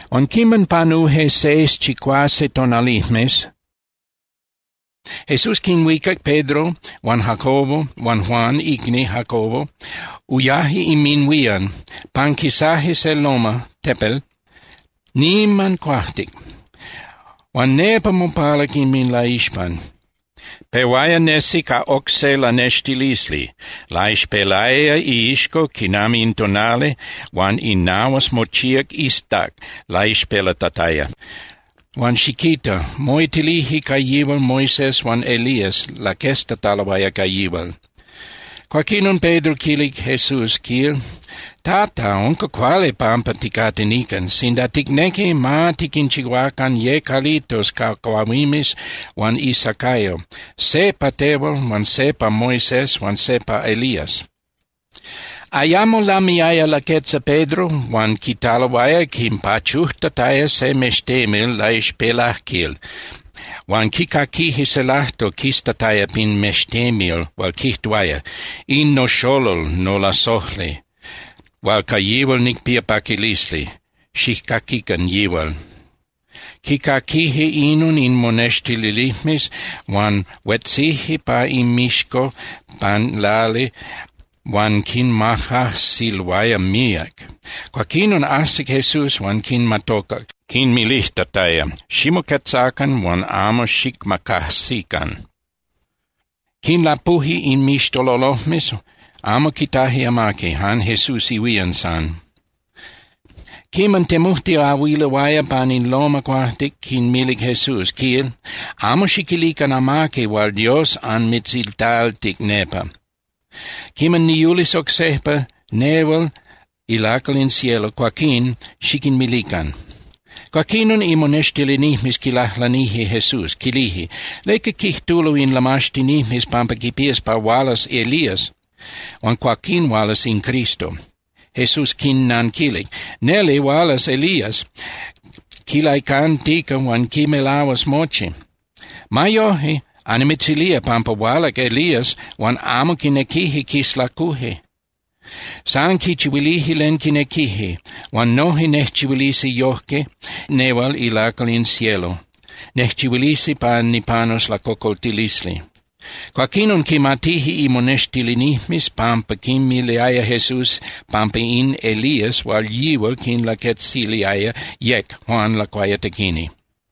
Huan quiman panuje seis (chicuase) tonalijmes, Jesús quinhuicac Pedro huan Jacobo huan Juan icni Jacobo, uyaje inminhuían. Panquisaje se loma (tepel) niman cuajtic. Huan nepa mopalac inminlaixpan, pehuaya nesi ca oc se lanextilisli. Laixpelaya iixco quinami in tonali, huan inahuas mochíac iztac laixpelatataya. Huan ¡xiquita!, moitilije ca yihual Moisés huan Elías laqueztataloaya ca yihual. Cuaquinon Pedro quilic Jesús, quil: —Tata, ¡unca cuali pampa ticate nican! Sinda ticnequi, ma tiquinchihuacan ye calitos ca cuahuimes huan isacayo, se pa tehual huan se pa Moisés huan se pa Elías. Ayamo lamiaya laquetza Pedro huan quitaloaya quinpachujtataya se mextemil laixpelajquil huan quicaquije se lajtol quistataya pin mextemil hual quijtuaya: —In noxolol nolasojli, hual ca yihual nicpía paquilisli. Xijcaquican yihual. Quicaquije inon in monextilinijmes, huan huetzije pa inmixco pan lali huan quimacajsiloaya míac. Cuaquinon ajsic Jesús, huan quinmatocac, quinmilijtataya: —Ximoquetzacan huan amo xicmacajsican. Quinlapuje inmixtololojmes, amo quitaje amaqui, jan Jesús ihuían san. Quiman temujtiahuiloaya pan in loma cuajtic, quinmilic Jesús, quil: —Amo xiquilican amaqui hual Dios anmitzitaltic nepa. Quiman niyulis oc sejpa, nehual ilacal in cielo, cuaquín xiquinmilican. Cuaquinon imonextilinijmes quilajlanije Jesús, quilije: —¿Leca quijtulo in lamaxtinijmes pampa quipías pa hualas Elías, huan cuaquín hualas in Cristo? Jesús quinnanquilic: —Neli hualas Elías quilaicantica huan quimelahuas mochi. Ma yoje, annimitzilía pampa hualac Elías huan amo quinequije quislacuje. San quichihuilije len quinequije. Huan noje nejchihuilisi yojque nehual ilacal in cielo. Nejchihuilisi pa nipanus lacocoltilisli. Cuaquinon quimatije imonextilinijmes pampa quinmiliaya Jesús pampa in Elías hual yihual quinlaquetziliaya yec Juan Lacuayatequini.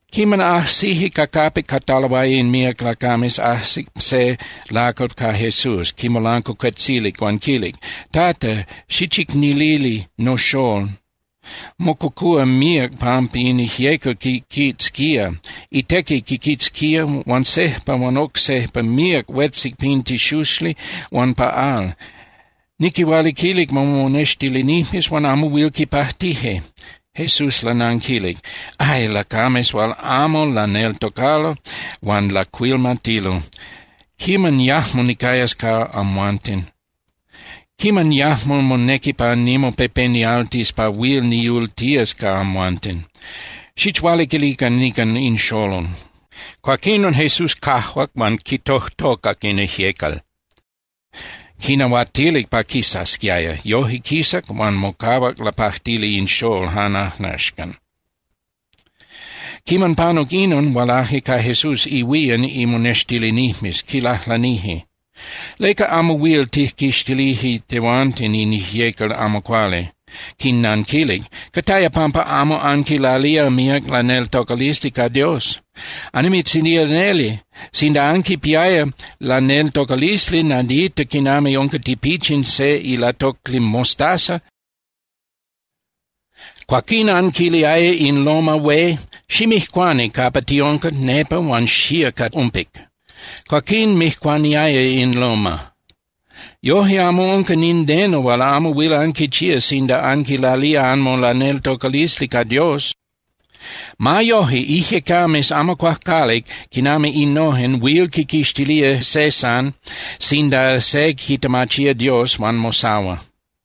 Quiman ajsije ca capic cataloaya in míac lacames, ajsic se lacal ca Jesús, quimolancuacuetzilic huan quilic: —Tata, xichicnilili noxól. Mococúa míac pampa in ijyecal quiquitzquía. Itequi quiquitzquía huan sejpa huan oc sejpa míac huetzic pin tixuxli huan pa al. Niquihualiquilic momonextilinijmes huan amo huil quipajtije. Jesús lananquilic: —¡Ay, lacames hual amo laneltocalo huan lacuilmatilo! ¿Quiman yajmo nicayas ca amhuanten? ¿Quiman yajmo monequi pa nimopepenialtis pa huil niyultías ca amhuanten? Xichualiquilican nican in xolol. Cuaquinon Jesús cajuac huan quitojtocac in ijyecal, quinahuatilic pa quisasquiaya. Yoje quisac huan mocahuac lapajtili in xolol jan axcan. Quiman panuc inon, hualaje ca Jesús ihuían imonextilinijmes, quilajlanije: —¿Leca amo huil tijquixtilije tehuanten in ijyecal amo cuali? Quinnanquilic: —Cataya pampa amo anquilalía míac laneltocalisli ca Dios. Annimitzilía neli, sinda anquipiaya laneltocalisli nadita quinami unca tipichin se ilatocli mostaza, cuaquín anquiliaya in loma (tepel) hué: “Ximijcuani capa tiunca nepa huan xía ca umpic”, cuaquín mijcuaniaya in loma. Yoje amo unca nindeno hual amo huil anquichía sinda anquilalía anmolaneltocalisli ca Dios. Ma yoje, ijyecames amo cuajcuali quinami innojen huil quiquixtilía se jan sinda se quitemachía Dios huan mosahua.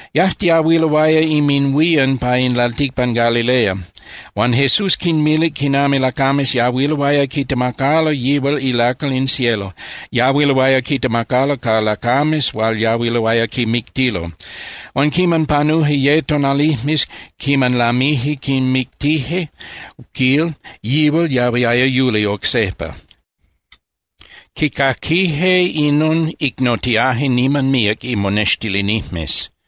Yajtiahuiloaya inminhuían pa in lalticpan Galilea. Huan Jesús quinmilic quinami lacames yahuiloaya quitemacalo yihual ilacal in cielo, yahuiloaya quitemacalo ca lacames hual yahuiloaya quimictilo. Huan quiman panuje ye tonalijmes quiman lamije quimictije, quil, yihual yahuiaya yuli oc sejpa. Quicaquije inon, icnotiaje niman míac imonextilinijmes.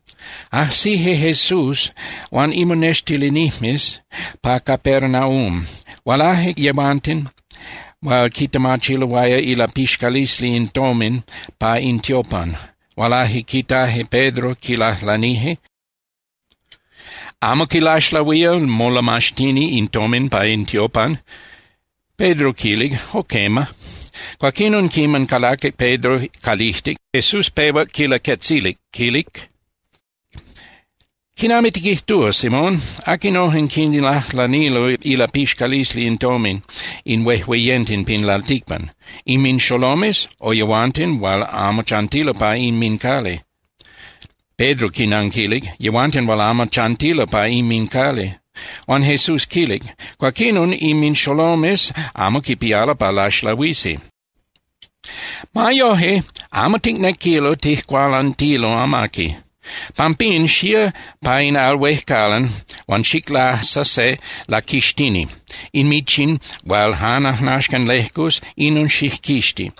Ajsije Jesús huan imonextilinijmes pa Capernaum, hualaje yehuanten hual quitemachiloaya ilapixcalisli in tomin pa in tiopan. Hualaje quitaje Pedro, quilajlanije: —¿Amo quilaxlahuía molamaxtini in tomin pa in tiopan? Pedro quilic: —Jo quema. Cuaquinon quiman calaquic Pedro calijtic, Jesús pehuac quilaquetzilic, quilic: —¿Quinami tiquijtúa, Simón? ¿Aquinojen quinlajlanilo ilapixcalisli in tomin in huejueyenten pin lalticpan? ¿Inminxolomes o yehuanten hual amo chantilo pa inmincali? Pedro quinanquilic: —Yehuanten hual amo chantilo pa inmincali. Huan Jesús quilic: —Cuaquinon, inminxolomes amo quipialo pa laxlahuisi. Ma yoje, amo ticnequilo tijcualantilo amaqui. Pampín, xía pa in al huejcalan huan xiclasa se laquixtini. In michin hual jan ajnaxcan lejcus, inon xijquixti.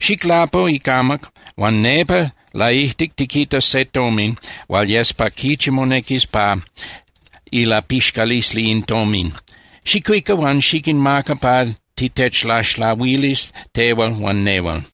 Xiclapu icamac huan nepa laijtic tiquitas se tomin hual yes pa quichi monequis pa ilapixcalisli in tomin. Xicuica huan xiquinmaca pa titechlaxlahuilis tehual huan nehual.